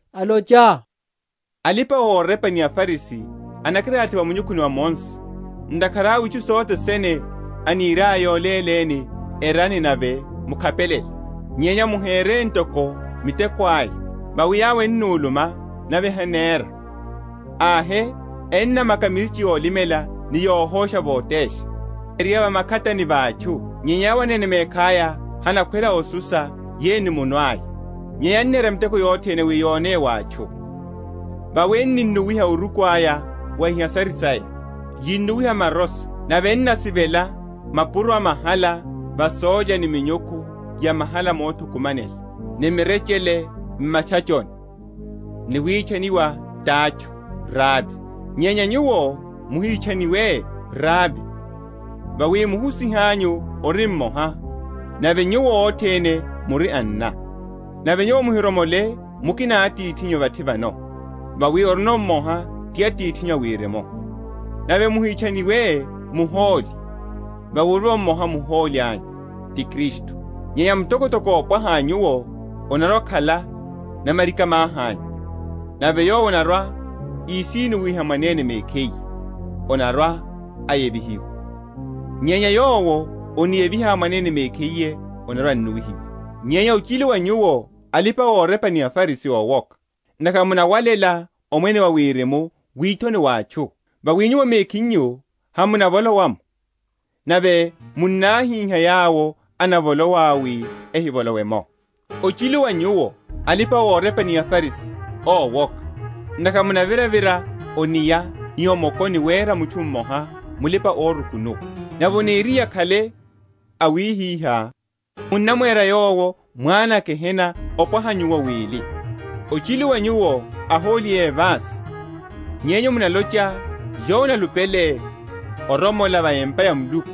alocha, Alipa‐orepa ni aFarisi enakilathi va munyukhuni wa Mose; ntakhara awe itchu sothe sene eniryaya yoléleni, erani nave mukhapelele: nyenya muhere ntoko miteko aya; vawi yawo ennuluma, nave henera. Ahe, ennamaka mirichi yolimela ni yohosha votesha, ereya va makhatani a atchu; nyenya yawo anene mekhaya henakhwela osusa yeyo ni munwe aya. Nyenya ennera miteko yothene wi yoneye wa atchu: vawi enunnuwiha oruku aya wa ihasiri saya, yunnuwiha maroso, nave ennasivela mapuro a mahala va sólya ni minyukhu ya mahala mothukumanela, ni mirechele m’matchachoni, ni witchaniwa ti atchu, Rabi. Nyenya nyuwo muhitchaniwe, Rabi; vawi muhusihanyu ori mmoha, nave nyuwo othene muri anna. Nave nyuwo muhiromole mukina atithinyu vathi vano, vawi orivo mmoha ti Atithinyu a Wirimu. Nave muhitchaniwe muhóli, vawi orivo mmoha Muhóli anyu, ti Kristu. Nyenya mtokotoko ópwaha a nyuwo anarwa‐akhala namarika‐mahi anyu. Nave yowo anarwa‐ísinnuwiha mwanene mekhiye anarwa‐ayevihiwa; nyenya yowo aniyeviha mwanene mekhiye anarwa‐annuwihiwa. Nyenya ochilu wa nyuwo, alipa‐orepa ni aFarisi, ówoka! ntakhara munawalela Omwene wa Wirimu withoni wa atchu: vawi nyuwo mekhinyu hamunavolowa’mo, nave munnahíha yawo enavolowa wi ehivolowe’mo. Ochilu wa nyuwo alipa‐orepa ni aFarisi, Ówoka! ntakhara munaviravira o’nia ni o mokoni wera mutchu mmoha mulipa‐orukunuwa; nave aniriye akhale awihiha, munnamwera yowo mwana a gehena opwaha nyuwo wili. Ochilu wa nyuwo ahóli évasi, yenyu munalocha, Yowo analupele oromola va empa ya Muluku,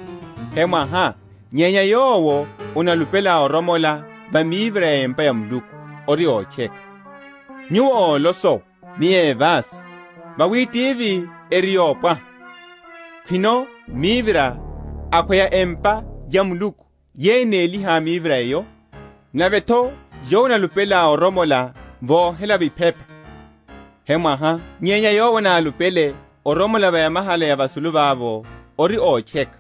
hemwaha; nyenya yowo analupele oromola va mivira ya empa ya Muluku, ori ótcheka. Nyuwo ólosowa, ni évasi: vawi tivi eri yopwaha, khwino mivira, akhweya empa ya Muluku yeyo enéliha mivira eyo? Nave’tho, Yowo analupele oromola vohelavo iphepa, hemwaha; nyenya yowo analupele oromola va yamahala ya vasulu vavo, ori ótcheka.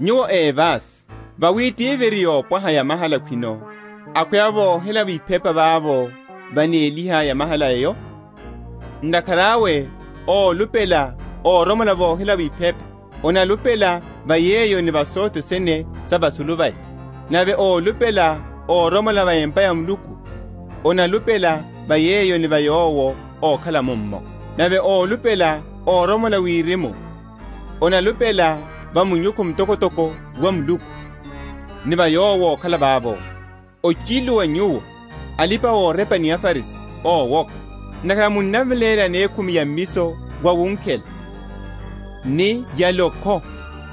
Nyuwo évasi, vawi tivi eri yopwaha yamahala khwino, akhweya vohelavo iphepa vavo vanéliha yamahala eyo? Ntakhara awe ólupela oromola vohelavo iphepa, analupela va yeyo ni va sothene sa vasulu vaya. Nave ólupela oromola va empa ya Muluku, analupela va yeyo ni va Yowo ókhala mummo. Nave ólupela oromola Wirimu, analupela va munyukhu mtokotoko wa Muluku, ni va Yowo ókhala vavo. Ochilu wa nyuwo, alipa‐orepa ni aFarisi, ówoka! ntakhara munaveléla yanekhumi ya mmiso wawunkhela, ni ya lókho,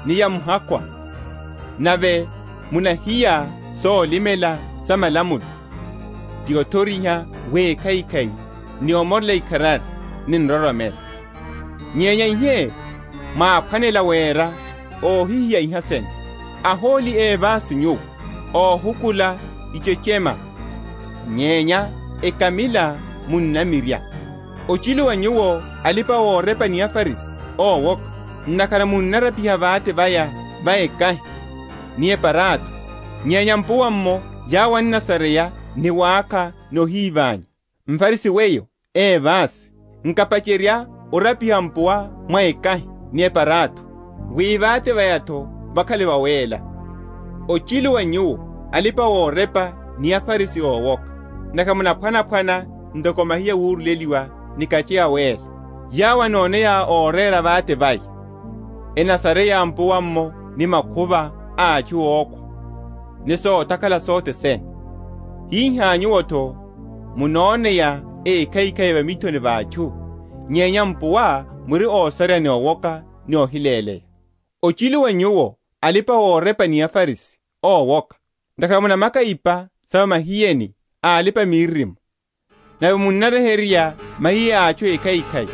ni ya muhakwa, nave munahiya solimela sa malamulo, ti othoriha wekhaikhai, ni omorela ikharari, ni nroromelo: nyenya ihe mwáphwanela wera, ohihiya iha sene. Ahóli évasi nyuwo, ohukula ichechema, nyenya ekamila munnamirya. Ochilu wa nyuwo, alipa‐orepa ni aFarisi, ówoka! ntakhara munarapiha vate vaya va ekahi ni eparatho, nyenya m’puwa’mmo yawo ennasareya ni wákha ni ohíványa. MFarisi weyo, évasi, nkapacherya orapiha mpuwa mwa ekahi ni eparatho, wi vate vaya’tho vakhale vawéla. Ochilu wa nyuwo, alipa‐orepa ni aFarisi, ówoka! ntakhara munaphwanaphwana ntoko mahiye awuruleliwa ni kache awéla, yewo anoneya orera vate vaya, enasareya mpuwa’mmo ni makhuva a atchu ókhwa ni sotakhala sothe sene. Hihá nyuwo’tho munoneya ékhaikhai va mithoni va atchu, nyenya mpuwa muri ósareya ni owoka ni ohiléleya. Ochilu wa nyuwo, alipa‐orepa ni aFarisi, ówoka! ntakhara munamaka ipa sa va mahiyeni a alipa‐miririmo, nave munaryeherya mahiye a atchu ékhaikhai,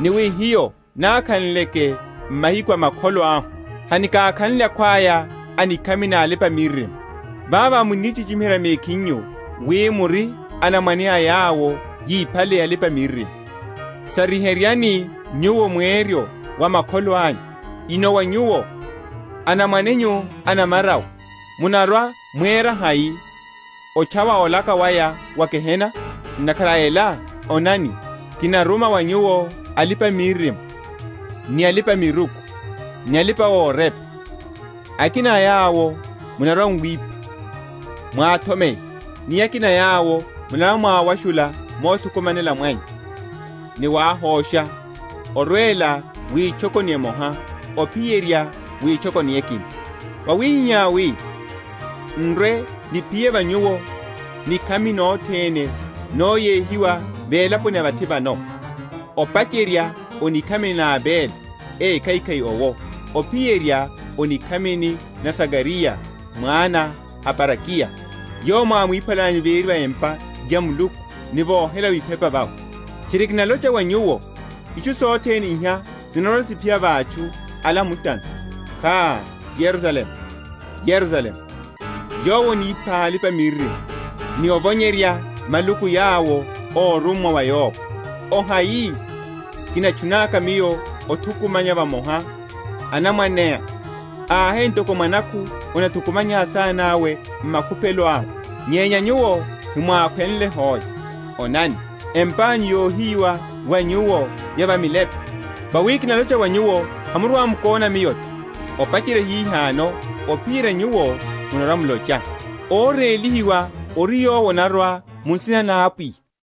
ni wi, Hiyo nakhanleke m’mahiku a makholo ahu, hanikakhanle akhwaya a nikhami na alipa‐miririmo. Vavo munnichichimiherya mekhinyu, wi muri anamwane a yawo yíphale alipa‐miririmo. Sariheryani nyuwo mweryo wa makholo anyu. Inowa nyuwo, anamwane nyu a namarawe, munarwa‐muwerya hai otchawa olaka waya wa gehena? Ntakhara a ela, onani, kinaruma wa nyuwo alipa‐miririmo, ni alipa‐miruku, ni alipa‐orepa: akina a yawo munarwa‐muwipha, mwathomeya; ni akina a yawo munarwa‐mwawashula mothukumanela mwanyu, ni wahosha, orwela witchokoni emoha, ophiyerya witchokoni ekina: wawihiha wi n’rwe‐niphiye va nyuwo nikhami nothene, noyehiwa velaponi ya vathi vano, opacherya o nikhamini na Abele ékhaikhai owo, ophiyerya o nikhamini na Zakariya mwana a Barakiya, yowo mwámwiphalanyu véri va empa ya Muluku ni vohelavo iphepa vawe. Tchiri kinalocha wa nyuwo, Itchu sothene iha sinarwa‐siphiya va atchu ala a mutano. Kha, Yerusalemu, Yerusalemu, yowo anipha alipa‐miririmo, ni ovonyerya maluku yawo órummwa wa yowo! ohai kinatchunaka miyo othukumanya vamoha anamwaneá, ahe ntoko mwanakhu annathukumanya asanawe m’makuphelo awe, nyenya nyuwo hemwákhwenle hoe! Onani, empanyu yohiyiwa wa nyuwo ya milepe. Vawi kinalocha wa nyuwo, Hamurwa‐mukóna Miyo’tho, opacherya hihano, ophiyerya nyuwo munarwa‐mulocha. Órélihiwa ori Yowo anarwa mu nsina na Apwiya.